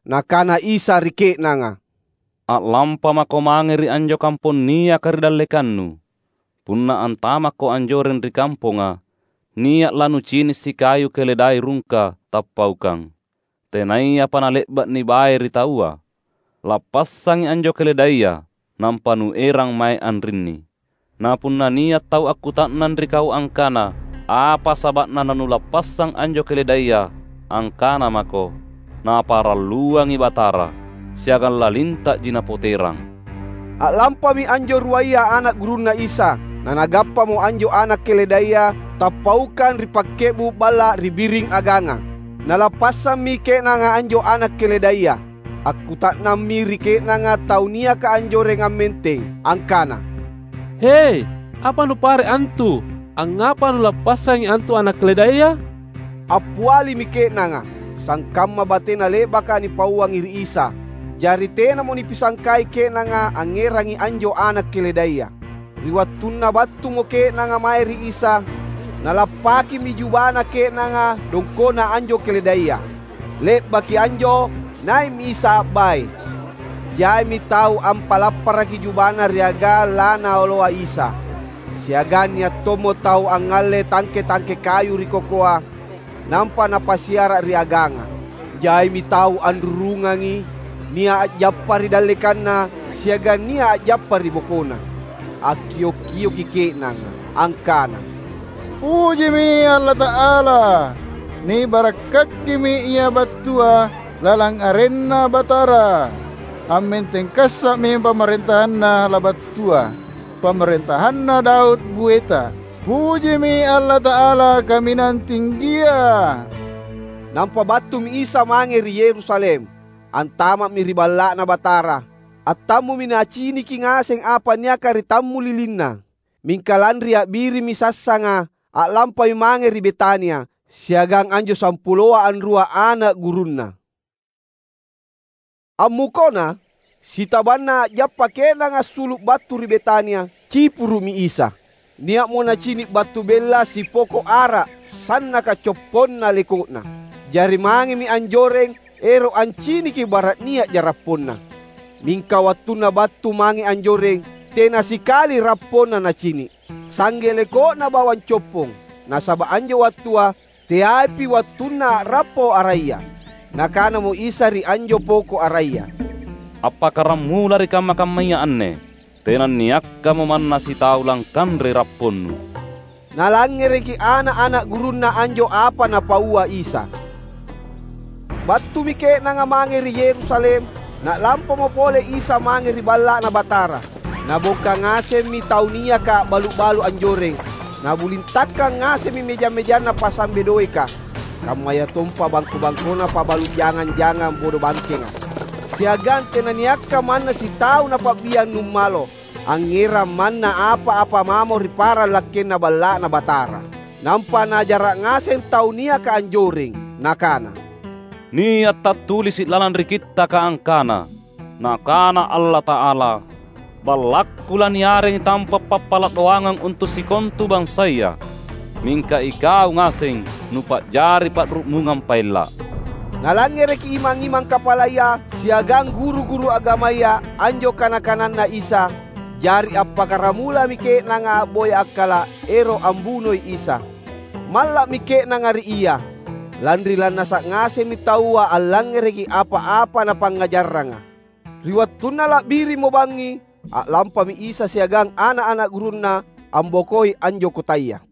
Nakana Isa ri ke’nanga, "A’lampamako mange ri anjo kampong niaka ri dallekannu. Punna antamakko anjoreng ri kamponga nia’ lanucini’ sikayu keledai rungka tappaukang, tenayapa nale’ba’ nibae ri taua. Lappassangi anjo keledaia nampa nuerang mae anrinni. Na punna nia’ tau akkuta’nang ri kau angkana apa saba’na nanulappassang anjo keledaia, angkana mako, ‘Naparalluangi Batara, siagang lalinta’ji Napoterang.’" A’lampami anjo ruaya ana’ gurunNa Isa, nanagappamo anjo ana’ keledaia tappaukang ri pakke’bu’ balla’ ri biring aganga. Nalappassammi ke’nanga anjo ana’ keledaia. Akkuta’nammi ri ke’nanga tau niaka anjoreng ammenteng angkana, "He, apa nupare’ antu? Angngapa nulappassangi antu ana’ keledaia?" Appialimi ke’nanga, sangkamma batena le’baka nipauangi ri Isa. Jari tenamo nipisangkai ke’nanga angngerangi anjo ana’ keledaia. Ri wattunna battumo ke’nanga mae ri Isa nalapakkimi jubana ke’nanga dongko’na anjo keledai. Le’baki anjo nai’mi Isa a’bae. Jaimi tau ampalaparaki jubana ri agang laNaoloa Isa. Siagang nia’ tommo tau angngalle tangke-tangke kayu ri kokoa, nampa napasiara’ ri aganga. Jaimi tau anrurungangi. Nia’ a’jappa ri dallekanNa, siagang nia’ a’jappa ri bokoNa. Akkio’-kioki ke’nanga angkana, "Pujimi Allata’ala! Nibarakkakimi Ia battua lalang arenNa Batara! Ammenteng kassa’mi pamarentahanNa labattua, pamarentahanna Daud boeta. Pujimi Allata’ala Kaminang Tinggia!" Nampa battumi Isa mange ri Yerusalem. Antama’mi ri Balla’Na Batara. Attammumi Naciniki ngaseng apa niaka ri tammulilinNa. Mingka lanri a’birimmi sassanga, a’lampami mange ri Betania siagang anjo sampuloa anrua ana’ gurunNa. Ammukona, sitabanna a’jappa ke’nanga assulu’ battu ri Betania, cipuru’mi Isa. Nia’mo Nacini’ battu bella sipoko’ ara sannaka copponna leko’na. Jari mangemi anjoreng ero’ anciniki bara’ nia’ja rapponna. Mingka wattunna battu mange anjoreng, tena sikali rapponna Nacini’. Sangge leko’na bawang coppong, nasaba’ anjo wattua teaipi wattunna a’rappo araya. Nakanamo Isa ri anjo poko’ araya, "Appakkaramula ri kamma-kammaya anne, tenanniakkamo manna sitau langkanrei rapponnu!" Nalangngereki ana’-ana’ gurunNa anjo apa Napaua Isa. Battumi ke’nanga mange ri Yerusalem. Na’lampamo pole Isa mange ri Balla’Na Batara. Nabongka ngasemmi tau niaka a’balu’-balu’ anjoreng. Nabulintakkang ngasemmi mejang-mejanna pasambe doeka, kammayatompa bangko-bangkona pabalu’ jangang-jangang bodobangkenga. Siagang tenanniakka manna sitau Napa’biang numalo angngerang manna apa-apa mamo ri parang lakkenna Balla’Na Batara. Nampa Naajara’ ngaseng tau niaka anjoreng. Nakana, "Nia’ tattulisi’ lalang ri Kittaka angkana: Nakana Allata’ala, ‘BallakKu laniarengi tampa’ pappala’ doangang untu’ sikontu bansaya.’ Mingka ikau ngaseng nupa’jari pa’ru’mungang paella’!" Nalangngereki imang-imang kapalaya siagang guru-guru agamaya anjo kana-kananNa Isa. Jari appakkaramulami ke’nanga a’boya akkala’ ero’ ambunoi Isa. Malla’mi ke’nanga ri Ia, lanri lannasa’ ngasemmi taua allangngereki apa-apa Napangngajarranga. Ri wattunna la’birimmo bangngi a’lampami Isa siagang ana’-ana’ gurunNa ambokoi anjo kotaya.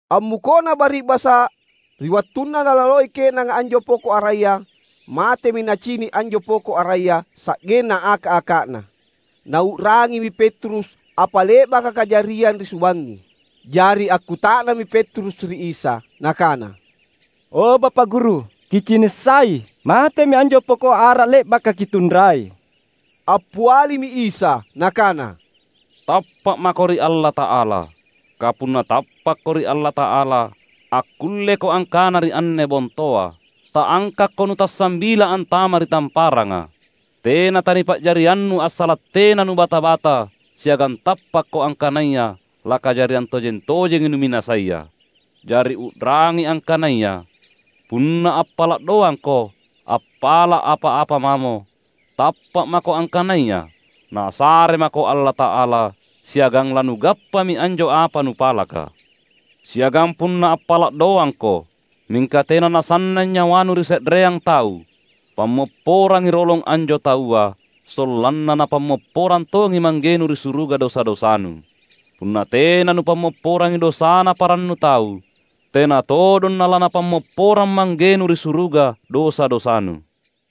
Ammukona bari’basa’, ri wattunna nalaloi ke’nanga anjo poko’ araya, matemi nacini’ anjo poko’ araya sa’genna aka’-aka’na. Nau’rangimi Petrus apa le’baka kajariang ri subangngi. Jari akkuta’nammi Petrus ri Isa nakana, "O Bapa’ Guru, Kicini’ sai! Matemi anjo poko’ ara le’baka Kitunrai!" Appialimi Isa Nakana, "Tappa’ mako ri Allata’ala. Kapunna tappakko ri Allata’ala, akkulleko angkana ri anne bontoa, ‘Ta’angkakko nutassambila antama’ ri tamparanga!’ Tena tanipa’jariannu, assala’ tena nubata-bata siagang tappakko angkanaya lakajariang tojeng-tojengi numinasaia. Jari u’rangi angkanaya: Punna appala’ doangko appala’ apa-apa mamo, tappa’ mako angkanaya Nasare mako Allata’ala, siagang lanugappami anjo apa nupalaka. Siagang punna appala’ doangko, mingka tena nasannang nyawanu ri se’reang tau, pammopporangi rolong anjo taua, sollanna Napammopporang tongi Manggenu ri suruga dosa-dosanu. [Punna tena nupammopporangi dosana parannu tau, tena todong na laNapammopporang Manggenu ri suruga dosa-dosanu.]"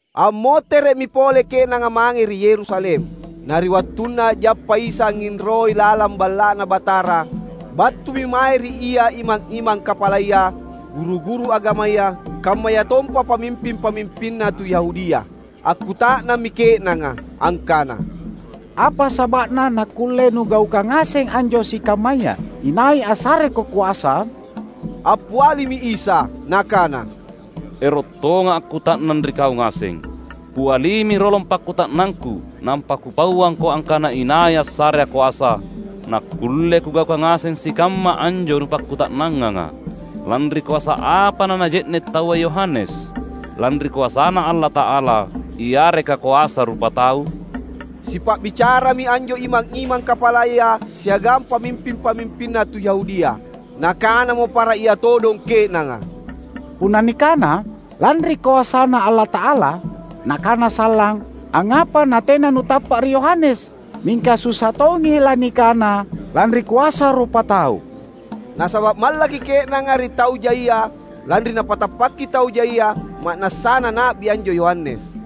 Ammotere’mi pole ke’nanga mange ri Yerusalem. Na ri wattunna a’jappa Isa angnginroi lalang Balla’Na Batara battumi mae ri Ia imang-imang kapalaya, guru-guru agamaya, kammayatompa pamimping-pamimpinna tu Yahudia. Akkuta’nammi ke’nanga angkana, "Apa saba’na nakkulle Nugaukang ngaseng anjo sikammaya? Inai assareKo koasa?" Appialimi Isa Nakana, "Ero’ tongA’ akkuta’nang ri kau ngaseng. Pialimi rolong pakkuta’nangKu nampa Kupauangko angkana inai assareA’ koasa nakkulle Kugaukang ngaseng sikamma anjo nupakkuta’nanganga. Lanri koasa apa nanaje’ne’ taua Yohanes; lanri koasaNa Allata’ala yareka koasa rupatau?" Sipa’bicarami anjo imang-imang kapalaya siagang pamimping-pamimpinna tu Yahudia. Nakanamo para ia todong ke’nanga, "Punna nikana, ‘lanri koasaNa Allata’ala,’ Nakana sallang, ‘Angngapa natena nutappa’ ri Yohanes?’ Mingka susa tongi lanikana, ‘Lanri koasa rupatau.’" Nasaba’ mallaki ke’nanga ri tau jaia lanri napatappaki tau jaia ma’nassana na’bi anjo Yohanes.